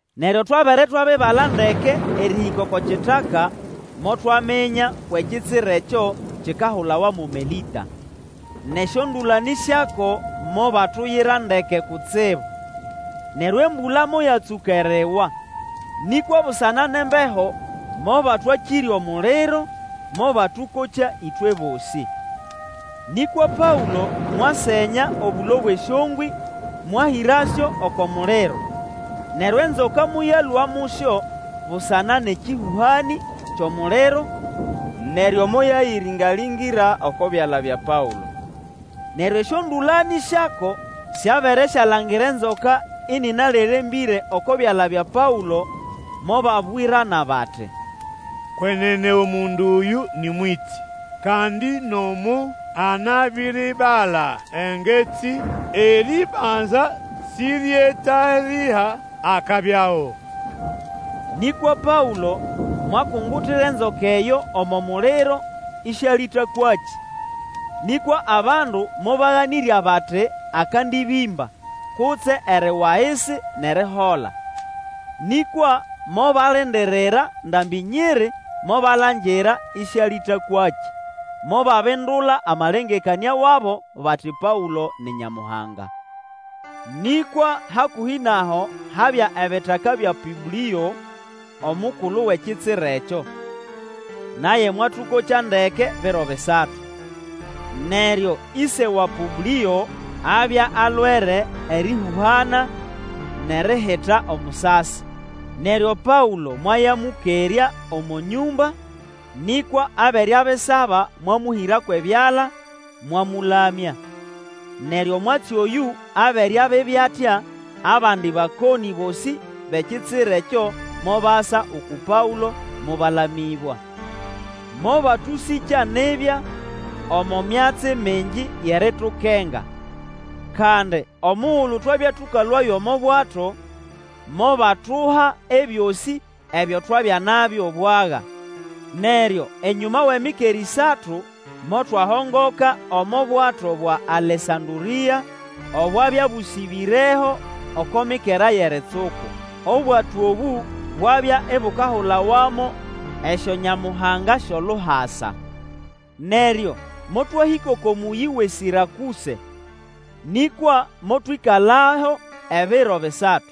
Neryo twabere twabibala ndeke erĩhĩka oko kitaka, motwaminya kwʼekitsira ekyo kikahulawa mo Melĩta. Nʼesyondũlanĩ syako mobatuyira ndeke kutsibu. Neryo embũla moyatsũka eriwa, nĩkwa busana nʼembeho mobatwakĩrya omuliro, mobatũkokya ĩtwe bosĩ. Nĩkwa Paũlo mwasenya obũlo bwʼesyongwĩ, mwahĩrasyo oko muliro, neryo enzoka moyalũa mũsyo busana nʼekĩhũhanĩ kyʼomuliro, neryo moyayĩrĩnga-lĩngĩra oko byala bya Paũlo. Neryo esyondũlanĩ syako syabere syalangira enzoka ĩnĩnalerembĩre oko byala bya Paũlo, mobabwirana bati, Kwenene omundu oyũ nĩ mwĩtĩ. Kandi nomo anabiribala engetsi, erĩbanza sĩryetalĩga akabyaho. Nĩkwa Paũlo mwakungutira enzoka eyo omo muliro, ĩsĩalĩtakwakĩ. Nĩkwa abandu mobaganĩrya bati akandĩbĩmba, kutse eriwa ahisi nʼerihola. Nĩkwa mobalindirira ndambĩ nyiri, mobalangira ĩsĩalĩtakwakĩ, mobabindula amalengekanĩa wabo, bati Paũlo ni nyamuhanga! Nĩkwa hakũhĩ nʼaho habya ebitaka bya Pũblĩo omukulu wʼekitsira ekyo. Naye mwatũkokya ndeke biro bisatu. Neryo ĩse wa Pũblĩo abya alwere erĩhũhana nʼerihita omusasi. Neryo Paũlo mwayamũkerya omo nyũmba, nĩkwa abere abisaba mwamũhĩra kwʼebyala, mwamũlamya. Neryo omwatsi oyũ abere abibya atya, abandi bakonĩ bosĩ bʼekitsira ekyo mobasa uku Paũlo, mobalamĩbwa. Mobatũsĩkya nibya, omo myatsi mingi yʼeritukenga. Kandi omugulu twabya tũkalũayo omo bwato, mobatuha ebyosĩ ebyo twabya nabyo bwaga. Neryo enyũma wʼemikera ĩsatu, motwahongoka omo bwato bwa Alesandũrĩa obwabya bũsĩbĩreho oko mikera yʼeritsuku. Obwato obũ bwabya ibukahulawa mo Esyonyamuhanga syʼOluhasa. Neryo motwahĩka oko mũyĩ wʼe Sĩrakũse, nĩkwa motwĩkalaho ebiro bisatu.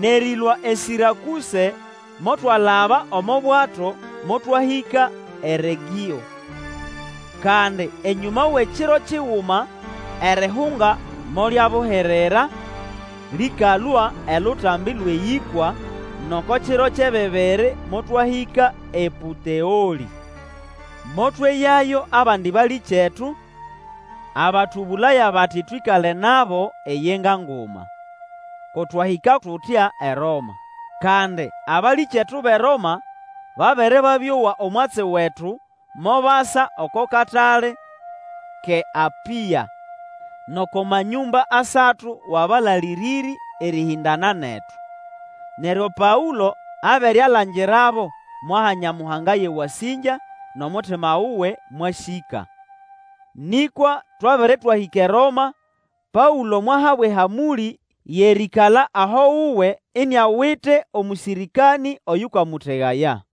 Nʼerĩlũa eSĩrakũse, motwalaba omo bwato motwahĩka eRegĩo. Kandi enyũma wʼekiro kiguma, erihunga molyabuhirira, lĩkalũa elutambi lwʼeyĩkwa, nʼoko kiro kyʼebibiri motwahĩka ePũteolĩ. Motweyayo abandi balĩkyetu, abatũbũlaya bati twĩkale nabo eyenga nguma. Ko twahĩka tutya eRoma. Kandi abalĩkyetu bʼeRoma, babere babĩowa omwatsi wetu, mobasa oko Katale kʼeApĩa nʼoko Manyũmba Asatu wʼAbalalĩrĩrĩ, erĩhĩndana netu. Neryo Paũlo abere alangirabo, mwaha Nyamuhanga yʼewasĩngya, nʼomutima wuwe mwasĩka. Nĩkwa twabere twahĩka eRoma, Paũlo mwahabwa ehamũlĩ yʼerĩĩkala aho wuwe iniawite omũsĩrĩkanĩ oyũkamũtegaya.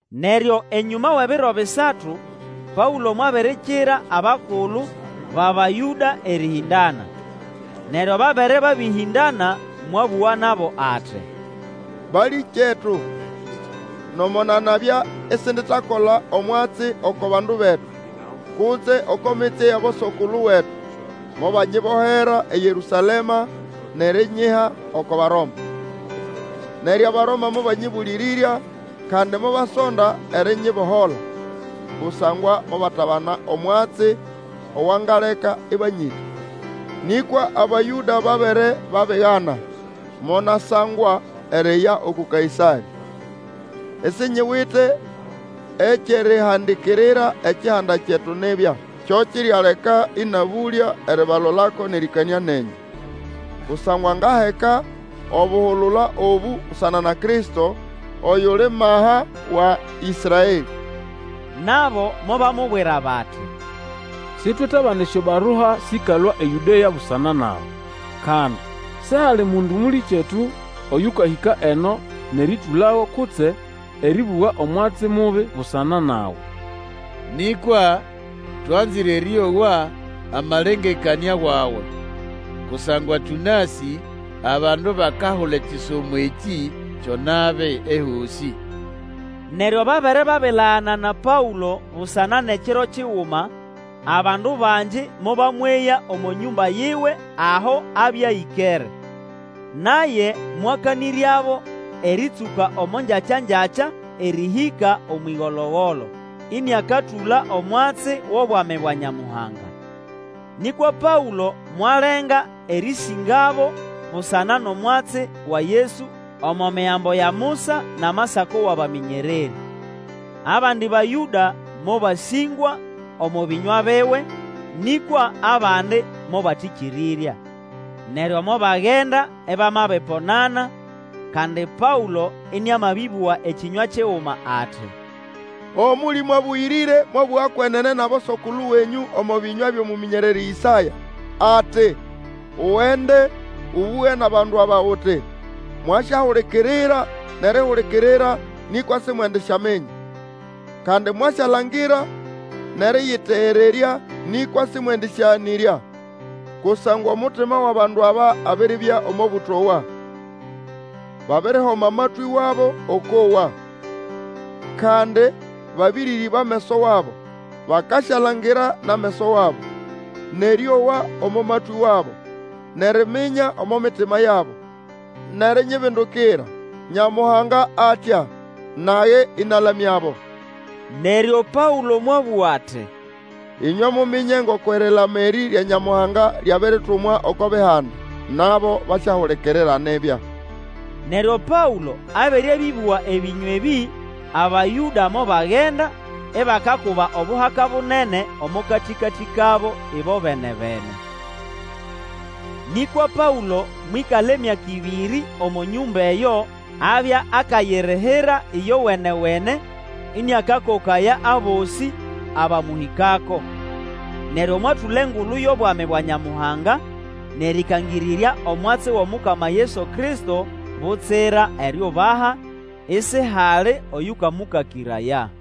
Neryo enyũma wʼebiro bisatu, Paũlo mwabirikira abakulu bʼAbayũda erĩhĩndana. Neryo babere babĩhĩndana, mwabũga nabo ati, Balĩkyetu! Nomo nanabya isinditakola omwatsi oko bandu betu, kutse oko mitsye yʼabosokulu wetu, mobanyibohera eYerũsalema, nʼerinyiha oko Baroma. Neryo Abaroma mobanyĩbũlĩrĩrya, kandi mobasonda erinyibohola, kusangwa mobatabana omwatsi owangaleka ĩbanyĩta. Nĩkwa Abayũda babere babigana, monasangwa eriya uku Kaĩsarĩ, isinyiwite ekyʼerihandikirira ekihanda kyetu nibya. Kyo kirialeka ĩnabũlya eribalolako nʼerĩkanĩa nenyũ. Kusangwa ngaheka obuhulula obũ busana na Kristo, oyuli maha wa Ĩsraelĩ. Nabo mobamubwira bati, Sitwetabana esyobarua sĩkalũa eYũdea busana nawe. Kandi sihali mundu mũlĩkyetu oyũkahĩka eno nʼerĩtũlago kutse erĩbũga omwatsi mubi busana nawe. Nĩkwa twanzĩre erĩowa amalengekanĩa wawe, kusangwa tũnasĩ abandu bakahula ekisomo ekĩ kyo nabi ehosĩ. Neryo babere babilagana na Paũlo busana nʼekiro kiguma, abandu bangi mobamweya omo nyũmba yiwe aho abya ĩkere. Naye mwakanĩryabo erĩtsũka omo ngyakya-ngyakya erĩhĩka, omwʼĩgolo-golo, ĩnĩakatũla omwatsi wʼobwami bwa Nyamuhanga. Nĩkwa Paũlo mwalenga erĩsĩngabo busana nʼomwatsi wa Yesu omo Migambo ya Musa nʼamasako wʼabamĩnyererĩ. Abandi Bayũda mobasĩngwa omo bĩnywa biwe, nĩkwa abandi mobatĩkĩrĩrya. Neryo mobagenda ibamabiponana, kandi Paũlo ĩnĩamabĩbũga ekĩnywa kiguma ati, Omũlĩmũ Abũyĩrĩre mwabũga kwenene nʼabosokulu wenyũ omo bĩnywa byʼomũmĩnyererĩ Ĩsaya, ati, Ugende, ũbũge nʼabandu aba uti, Mwasyahulikirira, nʼerihulikirira, nĩkwa simwendisyaminya, Kandi mwasyalangira nʼerĩyĩtegererya, Nĩkwa sĩmwendĩsyaganĩrya. Kusangwa omutima wʼabandu aba abiribya omo bũtowa, Babirihoma amatwĩ wabo okwʼowa, Kandi babĩrĩrĩba ameso wabo, Bakasyalangira nʼameso wabo, Nʼerĩowa omo matwĩ wabo, Nʼeriminya omo mitima yabo, nʼerinyibindukira, Nyamuhanga atya, Nage ĩnalamyabo. Neryo Paũlo mwabũga ati, Ĩnywe muminye ngoko erilama erĩ rya Nyamuhanga lyabiritumwa oko Bihanda. Nabo basyahulikirira nibya! [ Neryo Paũlo abere bĩbũga ebĩnywa ebĩ, Abayũda mobagenda, ibakakuba obuhaka bunene, omo katĩkatĩ kabo ĩbobene-bene.] Nĩkwa Paũlo mwĩkala emyaka ĩbĩrĩ, omo nyũmba eyo abya akayirihira ĩyowene-wene, ĩnĩakakokaya abosĩ abamũhĩkako. Neryo mwatũla engulu yʼobwami bwa Nyamuhanga, nʼerĩkangĩrĩrya omwatsi wʼomukama Yesu Kristo butsira eriubaha, isihali oyũkamũkakĩraya.